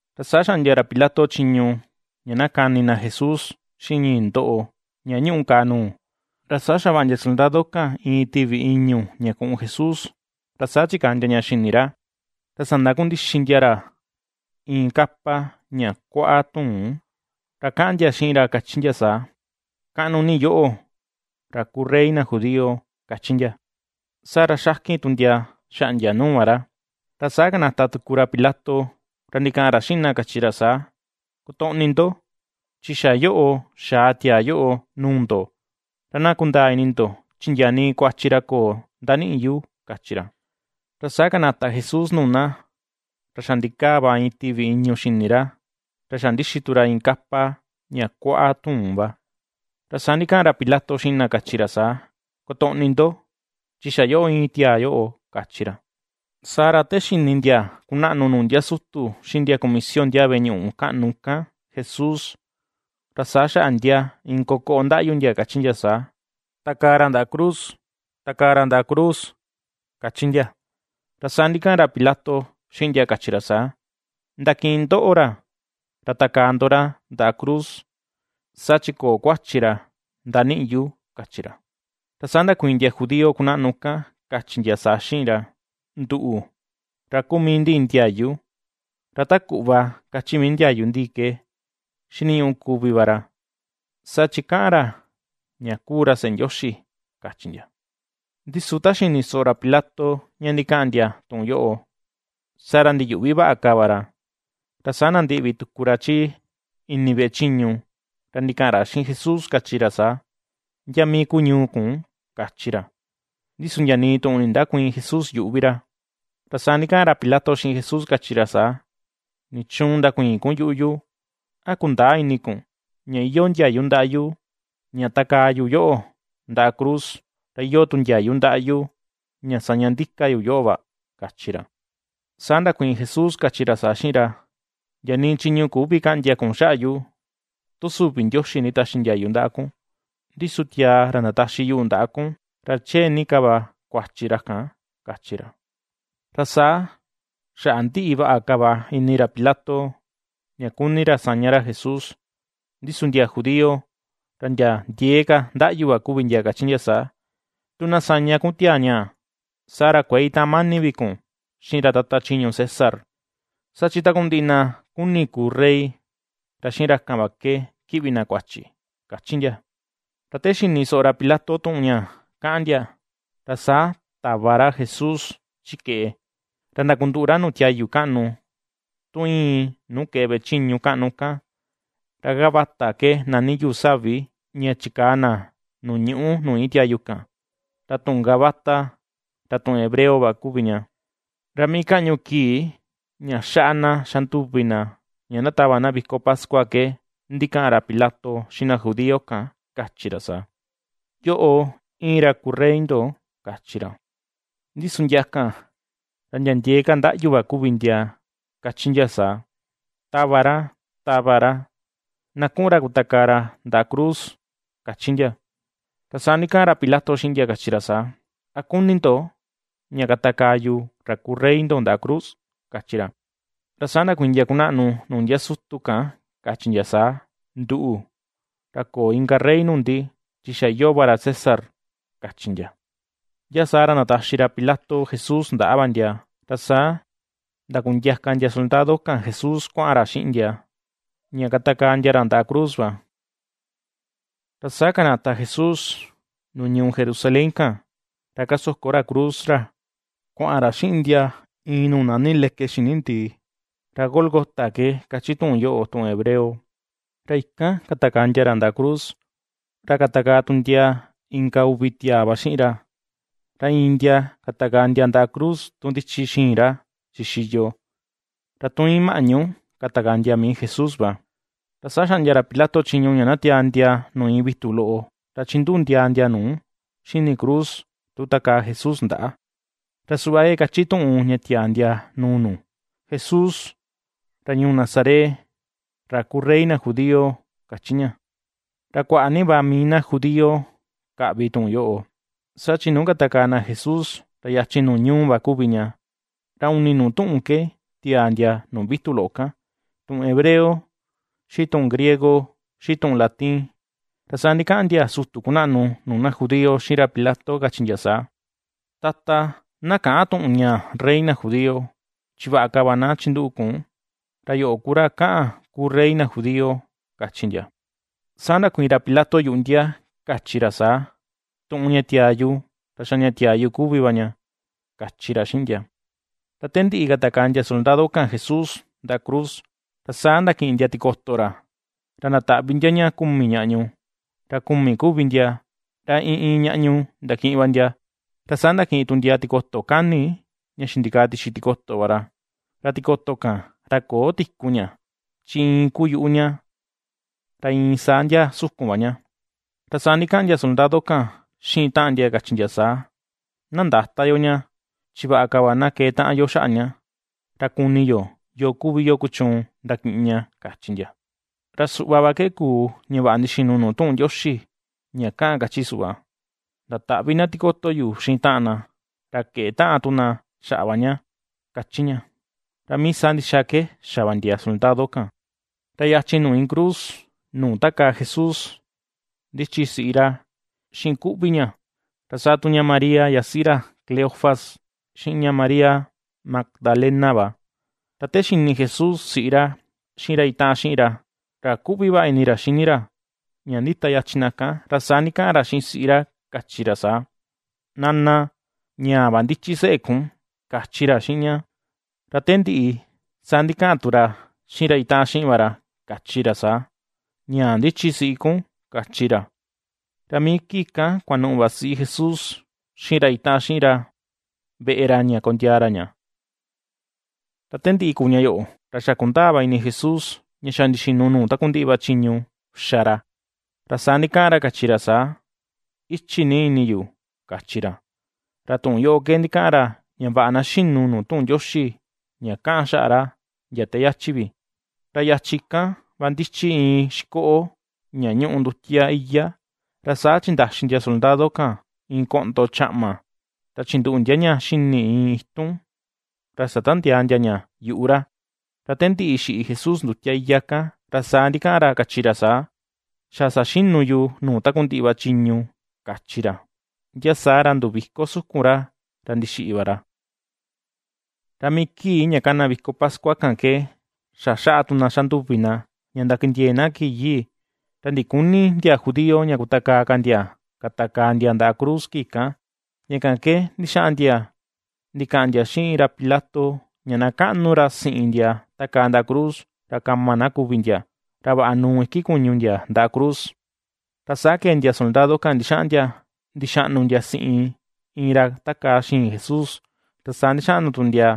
Ra saa xaꞌndia ra Pilato chiñu ña na kani na Jesús, xiꞌin ñii ndoꞌo ña ñuꞌu kàà nuu. Ra saa xavaꞌa ndia soldado kan iin tivi ìñu̱ ña kuꞌun Jesús, ra saa chikaa ndia ña xini ra, ra sandakundixi ndia ra iin kapa ña kuaꞌa tuun. Ra kaꞌan ndia xiꞌin ra kachi ndia saa: ―¡Kaꞌnu ni yoꞌo, ra kuu rey na judío! ―^kachi ndia. Saa ra xakin tu ndia xaꞌndia nuu va ra. Ra saa kanata tuku ra Pilato, ra ndikaꞌan ra xiꞌin na kachi ra saa: ―Kotoꞌni ndo, chi xa yoꞌo, xaa tiaa yoꞌo nuu ndo, ra na kundaa ini ndo, chi ndia nii kuachi ra köo ndaniꞌi yu ―kachi ra. Ra saa kanata Jesús nuu na, ra xa ndikaa va iin tivi ìñu̱ xini ra, ra xa ndixi tu ra iin kapa ña kuaꞌa tuun va. Ra saa ndikaꞌan ra Pilato xiꞌin na, kachi ra saa: ―¡Kotoꞌni ndo, chi xa yoꞌo íin tiaa yoꞌo! ―kachi ra. Saa ra te xini ndia kunaꞌnu nuu ndia sutu xiꞌin ndia kuu kumisio ndiaa veꞌe ñuꞌu kaꞌnu kan Jesús, ra saa xaꞌa ndia iin kokoꞌo ndaꞌyu ndia, kachi ndia saa: ―¡Takaa ra ndaꞌa cruz! ¡Takaa ra ndaꞌa cruz! ―^kachi ndia. Ra saa ndikaꞌan ra Pilato xiꞌin ndia kachi ra saa: ―Ndakiꞌin ndoꞌo ra, ra takaa ndo ra ndaꞌa cruz, saa chi köo kuachi ra ndaniꞌi yu ―kachi ra. Ra saa ndakuiin ndia judío kunaꞌnu kan kachi ndia saa xiꞌin ra: ―Nduꞌu, ra kuu mii ndi iin ndiayu, ra ta kuꞌva kachi mii ndiayu ndi ke xiniñuꞌu kuvi va ra, saa chi kaꞌan ra, ña kuu ra seꞌe Ndioxi ―kachi ndia. Ndi su ta xini soꞌo ra Pilato ña ndikaꞌan ndia tuꞌun yoꞌo, saa ra ndiyuꞌvi vaꞌa ka va ra. Ra saa nandiꞌvi tuku ra chi ini veꞌe chiñu, ra ndikaꞌan ra xiꞌin Jesús kachi ra saa: ―¿Ndia mii kuu ñuu kun? ―kachi ra. Ndi su ndia nii tuꞌun nindäkuiin Jesús yuꞌu vi ra. Ra saa ndikaꞌan ra Pilato xiꞌin Jesús, kachi ra saa: ―¿Nichuun ndakuïin kun yuꞌu yu? ¿A kundäa ini kun ña iyoo ndiayu ndaꞌa yu ña takaa yu yoꞌo ndaꞌa cruz, ra iyoo tu ndiayu ndaꞌa yu ña saña ndika yu yoꞌo va? ―kachi ra. Saa ndakuiin Jesús, kachi ra saa xiꞌin ra: ―Ndia nii chiñu küvi kaꞌndia kun xaꞌa yu, tu süvi Ndioxi nditaxi ndiayu ndaꞌa kun; ndi su tiaa ra ndataxi yuꞌu ndaꞌa kun, ra chee ni ka va kuachi ra kan ―kachi ra. Ra saa xaꞌa ndiꞌi vaꞌa ka va ini ra Pilato, ña kuni ra saña ra Jesús; ndi su ndia judío, ra ndia ndiee ka ndaꞌyu va kuvi ndia, kachi ndia saa: ―¡Tu na saña kun tiaa ñaa, saa ra kuëe itaꞌan mani vi kun xiꞌin ra tata chiñu César! ¡Saa chi takundiꞌi na kuni kuu rey, ra xiꞌin ra kan va ke kiꞌvi na kuachi! ―^kachi ndia. Ra te xini soꞌo ra Pilato tuꞌun ña kaꞌan ndia, ra saa tava ra Jesús chi keꞌe, ra ndakunduꞌu ra nuu tiayu kaꞌnu, tu íin nuu keꞌe veꞌe chiñu kaꞌnu kan, ra Gabata ke nani yuu savi ña chikaa na nuu ñuꞌu nuu iin tiayu kan, ra tuꞌun Gabata ra tuꞌun hebreo va kuvi ña. Ra mii kaꞌñu kii ña xaꞌa na xa nduvi na ña ndatava na viko pascua ke ndikaꞌan ra Pilato xiꞌin na judío kan, kachi ra saa: ―¡Yoꞌo, íin ra kuu rey ndo! ―kachi ra. Ndi su ndia kan ra ndia ndiee ka ndaꞌyu va kuvi ndia, kachi ndia saa: ―¡Tava ra! ¡Tava ra! Na kuꞌun ra kutakaa ra ndaꞌa cruz ―kachi ndia. Ra saa ndikaꞌan ra Pilato xiꞌin ndia, kachi ra saa: ―¿A kuni ndo, ña katakaa yu ra kuu rey ndo ndaꞌa cruz? ―kachi ra. Ra saa ndakuiin ndia kunaꞌnu nuu ndia sutu kan, kachi ndia saa: ―Nduꞌu, ra köo inka rey nuu ndi, chi xa iyoo va ra César ―kachi ndia. Ndia saa ra ndataxi ra Pilato Jesús ndaꞌa va ndia, ra saa ndakundiaka ndia soldado kan Jesús kuaꞌan ra xiꞌin ndia, ña katakaa ndia ra ndaꞌa cruz va. Ra saa kanata Jesús nuu ñuu Jerusalén kan, ra kasoko ra cruz ra kuaꞌan ra xiꞌin ndia iin nuu nani leke xini ndii, ra Gólgota ke kachi tuꞌun yoꞌo, tuꞌun hebreo. Ra ikan katakaa ndia ra ndaꞌa cruz, ra katakaa tu ndia, inka uvi tiaa va xiꞌin ra; ra iin ndia katakaa ndia ndaꞌa cruz tu ndichi xiin ra xixiyo, ra tun íin maꞌñu, katakaa ndia mii Jesús va. Ra saa xaꞌndia ra Pilato chiñu ña na tiaa ndia nuu iin vitu loꞌo, ra chinduꞌu ndia ndia nu xini cruz, tu takaa Jesús ndaꞌa, ra suꞌva ke kachi tuꞌun ña tiaa ndia nuu nu: “Jesús ra ñuu Nazaret, ra kuu rey na judío”, kachi ña. Ra kuaꞌa ni va mii na judío kaꞌvi tuꞌun yoꞌo, saa chi nuu katakaa na Jesús, ra yachin nuu ñuu va kuvi ña, ra uni nuu tuꞌun ke tiaa ndia nuu vitu loꞌo kan: tuꞌun hebreo, xiꞌin tuꞌun griego, xiꞌin tuꞌun latin. Ra saa ndikaꞌan ndia sutu kunaꞌnu nuu na judío xiꞌin ra Pilato, kachi ndia saa: ―Tata, na käꞌan tuꞌun ñaa “rey na judío”; chi vaꞌa ka va na chinduꞌu kun, “ra yoꞌo ku ra kaꞌan ku rey na judío” ―kachi ndia. Saa ndakuiin ra Pilato yuꞌu ndia, kachi ra saa: ―Tuꞌun ña tiaa yu, ra xa ña tiaa yu kuvi va ña ―kachi ra xiꞌin ndia. Ra te ndiꞌi katakaa ndia soldado kan Jesús ndaꞌa cruz, ra saa ndakiꞌin ndia tikoto ra, ra ndataꞌvi ndia ña kumi ñaꞌñu, ra kumi kuvi ndia, ra iin iin ñaꞌñu ndakiꞌin va ndia. Ra saa ndakiꞌin tu ndia tikoto kani ña xindikaa tixi tikoto va ra, ra tikoto kan, ra köo tiku ña chi iin kuu yuꞌu ña ra iin saa ndia sukun va ña. Ra saa ndikaꞌan ndia soldado kan xiꞌin taꞌan ndia, kachi ndia saa: ―Na ndäta yo ña, chi vaꞌa ka va na keꞌe taꞌan yo xaꞌa ña, ra kuni yo yoo kuvi yo kuchuun ndakiꞌin ña, ―kachi ndia. Ra suꞌva va ke kuu ña vaꞌa ndixinu nuu tuꞌun Ndioxi ña kaꞌan kachi suꞌva: “Ndataꞌvi na tikoto yu xiꞌin taꞌan na, ra keꞌe taꞌan tu na xaꞌa va ña”, kachi ña. Ra mii saa ndixa ke xa va ndia soldado kan. Ra yachin nuu iin cruz, nuu takaa Jesús ndichi siꞌi ra xiꞌin kuꞌvi ña, ra saa tu ña María yasiꞌi ra Cleofas, xiꞌin ña María Magdalena va. Ra te xini Jesús siꞌi ra xiꞌin ra itaꞌan xiꞌin ra, ra kuꞌvi vaꞌa ini ra xini ra, ña ndita yachin na kan, ra saa ndikaꞌan ra xiꞌin siꞌi ra, kachi ra saa: ―Nana, ñaa va ndichi seꞌe kun ―kachi ra xiꞌin ña. Ra te ndiꞌi, saa ndikaꞌan tu ra xiꞌin ra itaꞌan xiꞌin va ra, kachi ra saa: ―Ñaa ndichi siꞌi kun ―kachi ra. Ra mii kii kan kuanuꞌu va siꞌi Jesús, xiꞌin ra itaꞌan xiꞌin ra veꞌe ra ña kondiaa ra ña. Ra te ndiꞌi kuu ña yoꞌo, ra xa kundaa va ini Jesús, ña xa ndixinu nuu takundiꞌi va chiñu xa ra, ra saa ndikaꞌan ra, kachi ra saa: ―Ichi ni ini yu ―kachi ra. Ra tuꞌun yoꞌo ke ndikaꞌan ra, ña vaꞌa na xinu nuu tuꞌun Ndioxi ña kaꞌan xaꞌa ra, ndia te yachi vi. Ra yachin kan va ndichi iin xikoꞌo ña ñuꞌu ndutia iyá; ra saa chindaxi ndia soldado kan, iin koꞌndo chaꞌma, ra chinduꞌu ndia ña xini iin itun, ra satandiaa ndia ña yuꞌu ra. Ra te ndiꞌi xiꞌi Jesús ndutia iyá kan, ra saa ndikaꞌan ra, kachi ra saa: ―Xa saxinu yu nuu takundiꞌi va chiñu ―kachi ra. Ndia saa ra nduviko sukun ra, ra ndixiꞌi va ra. Ra mii kii ña kana viko pascua kan ke, xa xaꞌa tu na xanduvi na ña ndakindiee na kii yii, ra ndiküni ndia judío ña kutakaa ka ndia, katakaa ndia ndaꞌa cruz kii kan, ña kan ke ndixaꞌan ndia ndikaꞌan ndia xiꞌin ra Pilato, ña na kaꞌnu ra siꞌin ndia takaa ndaꞌa cruz, ra kama na kuvi ndia, ra vaꞌa nuu iki kuñu ndia ndaꞌa cruz. Ra saa kee ndia soldado kan ndixaꞌan ndia ndixaꞌnu ndia siꞌin iin ra takaa xiin Jesús, ra saa ndixaꞌnu tu ndia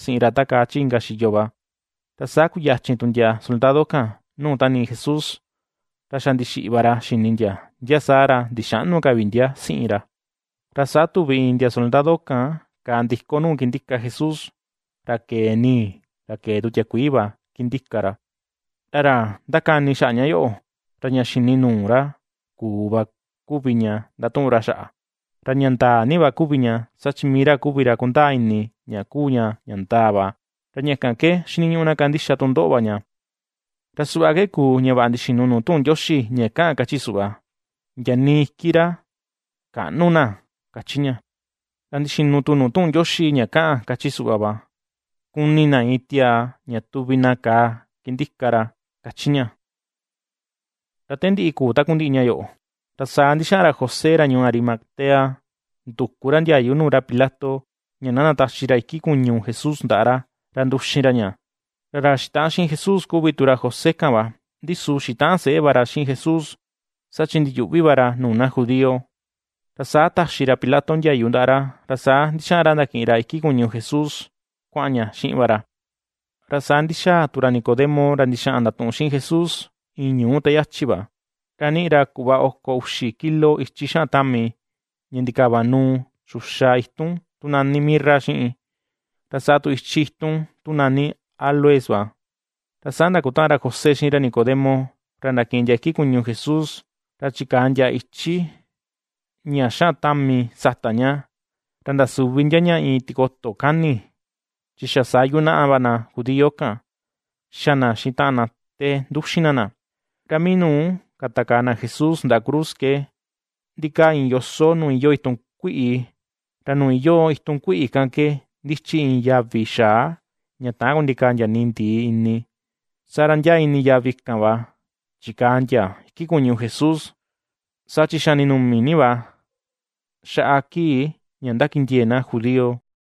siꞌin ra takaa chi inka xiyo va. Ra saa kuyachin tu ndia soldado kan nuu tanii Jesús, ra xa ndixiꞌi va ra xini ndia, ndia saa ra ndixäꞌnu ka vi ndia siꞌin ra. Ra saa tuvi iin ndia soldado kan kàà ndiko nuu kindika Jesús, ra kee nii, ra kee tu tiakuii va kindika ra. Ra ra ^ndakani xaꞌa ña yoꞌo, ra ña xini nuu ra kuu va, kuvi ña ndatuꞌun ra xaꞌa, ra ña ndaa ni va kuvi ña, saa chi mii ra kuvi ra kundaa ini, ña ^kuu ña ña ndaa va; ra ña kan ke xiniñuꞌu na kandixa tu ndoꞌo va ña. Ra suꞌva ke kuu, ña vaꞌa ndixinu nuu tuꞌun Ndioxi ña kaꞌan kachi suꞌva: “Ndia nii iki ra käꞌnu na”, ^kachi ña. Ra ndixinu tu nuu tuꞌun Ndioxi ña kaꞌan kachi suꞌva va: “Kuni na, iin tiaa ña tuvi na kàà kindika ra”, ^kachi ña. Ra te ndiꞌi kuu takundiꞌi ña yoꞌo, ra saa ndixaꞌan ra José ra ñuu Arimatea, nduku ra ndiayu nuu ra Pilato, ña na ndataxi ra iki kuñu Jesús ndaꞌa ra, ra nduxin ra ña, ra ra xitaꞌan xiꞌin Jesús kuvi tu ra José kan va, ndi su xitaꞌan seꞌe va ra xiꞌin Jesús, saa chi ndiyuꞌvi va ra nuu na judío, ra saa taxi ra Pilato ndiayu ndaꞌa ra, ra saa ndixaꞌan ra ndakiꞌin ra iki kuñu Jesús, kuaꞌan ña xiꞌin va ra. Ra saa ndixaa tu ra Nicodemo ra ndixaꞌan ndatuꞌun xiꞌin Jesús, iin ñuu te yachi va, ra niꞌi ra kuꞌva oko uxi kilo ichi xaꞌan tami, ña ndikava nuu, xuxa itun tu nani mirra xiꞌin, ra saa tu ichi itun, tu nani áloes va. Ra saa ndakutaꞌan ra José xiꞌin ra Nicodemo, ra ndakiꞌin ndia iki kuñu Jesús, ra chikaa ndia ichi ña xaꞌan tami sata ña, ra ndasuvi ndia ña iin tikoto kani, chi xa saa yunaꞌa va na judío kan, xa na xiꞌin taꞌan na te nduxin na na. Ra mii nuu katakaa na Jesús ndaꞌa cruz ke, ndikaa iin yoso nuu iyoo itun kuiꞌi, ra nuu iyoo itun kuiꞌi kan ke, ndichi iin yavi xaa ña täan kundikaa ndia nii, ndii ini. Saa ra ndia ini yavi kan va, chikaa ndia iki kuñu Jesús, saa chi xa ninumi ni va, xaꞌa kii ña ndakindiee na judío.